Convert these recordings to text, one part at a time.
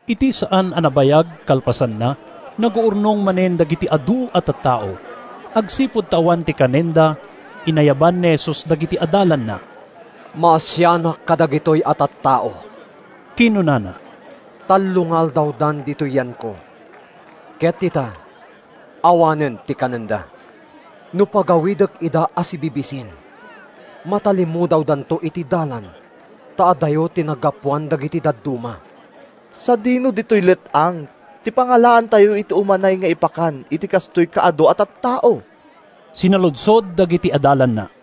Iti saan a nabayag kalpasanna, naguurnong manen dagiti adu a tattao. Agsipud ta awan ti kanenda, inayaban ni Jesus dagiti adalanna. “Maasianak kadagitoy a tattao,” kinunana. “Tallo nga aldawdan ditoy yanko, ket ita, awanen ti kanenda. No pagawidek ida a sibibisin, matalimudawdanto iti dalan ta adayo ti naggapuan dagiti dadduma.” “Sadino ditoy let-ang ti pangalaantayo iti umanay nga ipakan iti kastoy kaadu a tattao?” sinaludsod dagiti adalanna.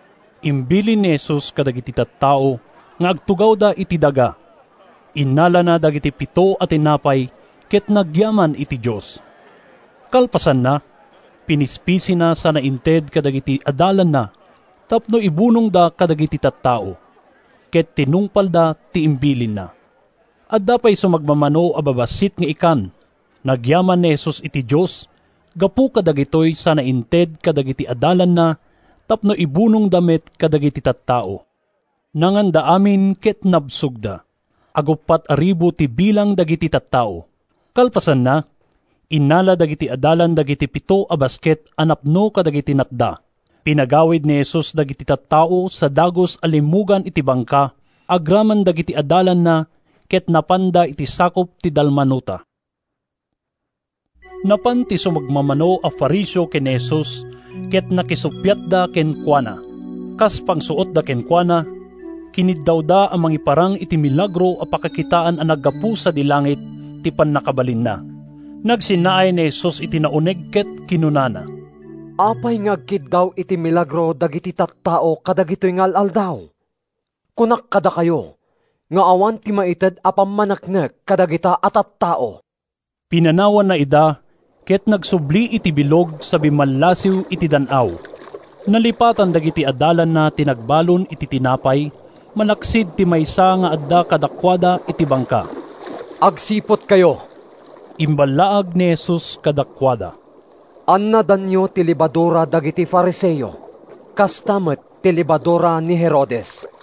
Imbilin ni Jesus kadagiti tattao nga agtugawda iti daga. Innalana dagiti pito a tinapay ket nagyaman iti Dios. Kalpasanna, pinispisina sana inted kadagiti adalanna tapno ibunongda kadagiti tattao. Ket tinungpalda ti imbilinna. Adda pay sumagmamano a babassit nga ikan. Nagyaman ni Jesus iti Dios gapu kadagitoy sana inted kadagiti adalanna tapno ibunongda met kadagiti tattao. Nanganda amin ket nabsogda—aguppat a ribu ti bilang dagiti tattao. Kalpasanna, innala dagiti adalan dagiti pito a basket a napno kadagiti natda. Pinagawid ni Jesus dagiti tattao sa dagus a limmugan iti bangka agraman dagiti adalanna ket napanda iti sakup ti Dalmanuta. Napan ti sumagmamano a Fariseo ken ni Jesus ket nakisuppiatda kenkuana. Kas pangsuotda kenkuana, kiniddawda a mangiparang iti milagro a pakakitaan a naggapu sadi langit ti pannakabalinna. Nagsennaay ni Jesus iti nauneg ket kinunana, “Apay nga agkiddaw iti milagro dagiti tattao kadagitoy nga al-aldaw? Kunak kadakayo nga awan ti maited a pammaneknek kadagita a tattao!” Pinanawanna ida ket nagsubli iti bilog sa bimmallasiw iti dan-aw. Nalipatan dagiti adalanna ti nagbalon iti tinapay malaksid ti maysa nga adda kadakuada iti bangka. “Agsiputkayo!” imballaag ni Jesus kadakuada. “Annadanyo ti lebadura dagiti Fariseo, kasta met ti lebadura ni Herodes.”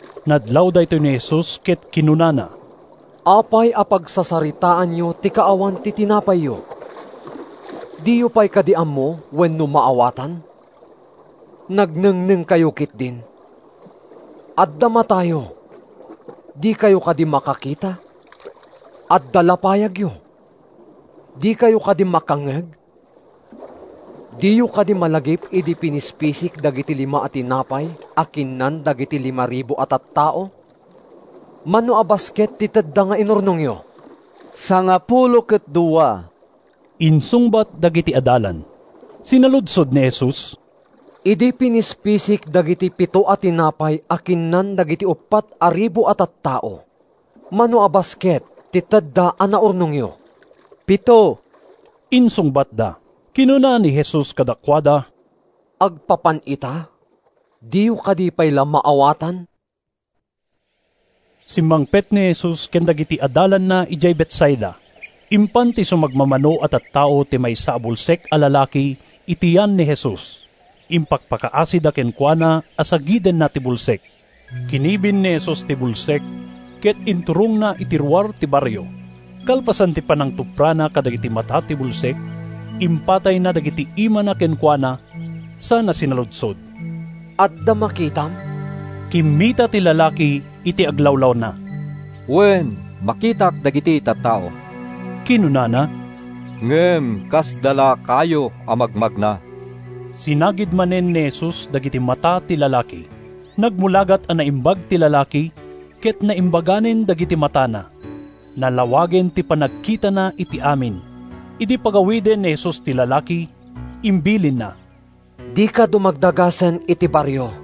Nadlaw daytoy ni Jesus ket kinunana, “Apay a pagsasaritaanyo ti kaawan ti tinapayyo? Diyo pay kadi ammo wenno maawatan? Nagnengnengkayo ketdin! Adda matayo; dikayo kadi makakita? Adda lapayagyo; dikayo kadi makangngeg? Diyo kadi malagip idi pinispisik dagiti lima a tinapay a kinnan dagiti limaribu a tattao? Mano a basket ti tedda nga inurnongyo?” “Sangapulo ket dua,” insungbat dagiti adalan. Sinaludsod ni Jesus, “Idi pinispisik dagiti pito a tinapay a kinnan dagiti uppat a ribu a tattao, mano a basket ti tedda a naurnongyo?” “Pito,” insungbatda. Kinuna ni Jesus kadakuada, “Agpapan ita, diyo kadi pay la maawatan?” Simmangpet ni Jesus ken dagiti adalanna idiay Betsaida. Impan ti sumagmamano a tattao ti maysa a bulsek a lalaki iti yan ni Jesus. Impakpakaasida kenkuana a sagidenna ti bulsek. Kinibin ni Jesus ti bulsek ket inturongna iti ruar ti barrio. Kalpasan ti panangtuprana kadagiti mata ti bulsek, impatayna dagiti imana kenkuana sana sinaludsod, “Adda makitam?” Kimmita ti lalaki iti aglawlawna. “Wen, makitak dagiti tattao,” kinunana, “ngem kasda la kayo a magmagna.” Sinagid manen ni Jesus dagiti mata ti lalaki. Nagmulagat a naimbag ti lalaki ket naimbaganen dagiti matana. Nalawagen ti panagkitana iti amin. Idi pagawiden ni Jesus ti lalaki, imbilinna, “Dika dumagdagasen iti barrio.”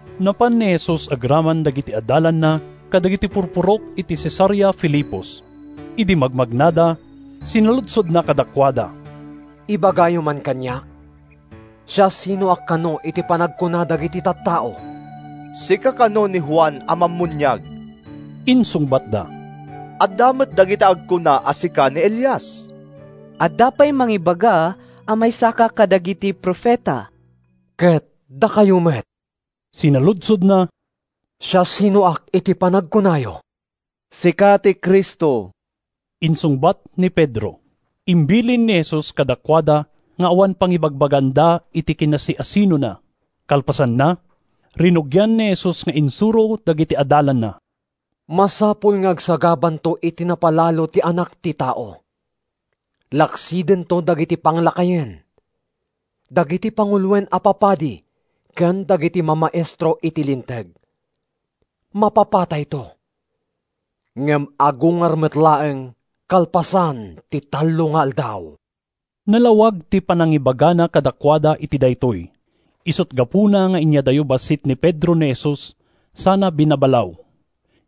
Napan ni Jesus agraman dagiti adalanna kadagiti purpurok iti Cesarea Filipos. Idi magmagnada, sinaludsodna kadakuada, “Ibagayo man kaniak, siasinoak kano iti panagkuna dagiti tattao?” “Sika kano ni Juan a Mammuniag,” insungbatda. “Adda met dagiti agkuna a sika ni Elias. Adda pay mangibaga a maysaka kadagiti profeta.” “Ket dakayo met,” sinaludsodna, “siasinoak iti panagkunayo?” “Sika ti Cristo,” insungbat ni Pedro. Imbilin ni Jesus kadakuada nga awan pangibagbagaanda iti kinasiasinona. Kalpasanna, rinugian ni Jesus nga insuro dagiti adalanna: “Masapul nga agsagabanto iti napalalo ti Anak ti Tao. Laksidento dagiti panglakayen, dagiti panguloen a papadi ken dagiti mamaestro iti Linteg. Mapapatayto, ngem agungar met laeng kalpasan ti tallo nga aldaw.” Nalawag ti panangibagana kadakuada iti daytoy. Isut’ gapuna nga inyadayo bassit ni Pedro ni Jesus sana binabalaw.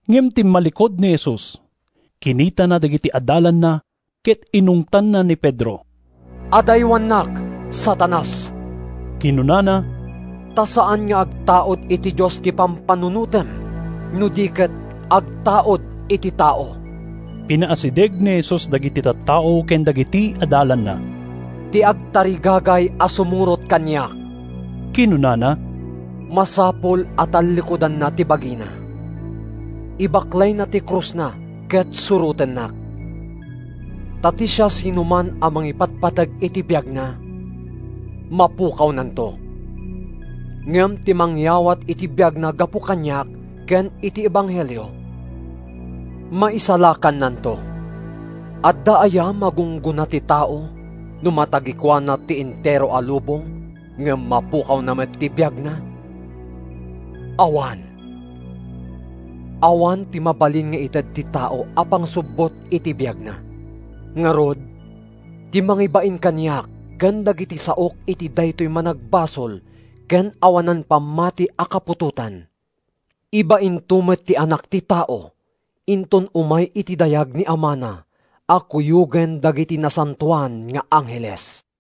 Ngem timmallikud ni Jesus, kinitana dagiti adalanna ket inungtanna ni Pedro. “Adaywannak, Satanas,” kinunana, “ta saan nga agtaud iti Dios ti pampanunotem no di ket agtaud iti tao.” Pinaasideg ni Jesus dagiti tattao ken dagiti adalanna. “Ti agtarigagay a sumurot kaniak,” kinunana, “masapul a tallikudanna ti bagina, ibaklayna ti krusna ket surotennak. Ta ti siasinoman a mangipatpateg iti biagna, mapukawnanto; ngem ti mangyawat iti biagna gapu kaniak ken iti ebanghelio, maisalakannanto. Adda aya magunggona ti tao no matagikuana ti entero a lubong ngem mapukawna met ti biagna? Awan! Awan ti mabalin nga ited ti tao a pangsubbot iti biagna. Ngarud, ti mangibain kaniak ken dagiti saok iti daytoy managbasol ken awanan pammati a kaputotan, ibainto met ti Anak ti Tao inton umay iti dayag ni Amana a kuyogen dagiti nasantoan nga angheles.”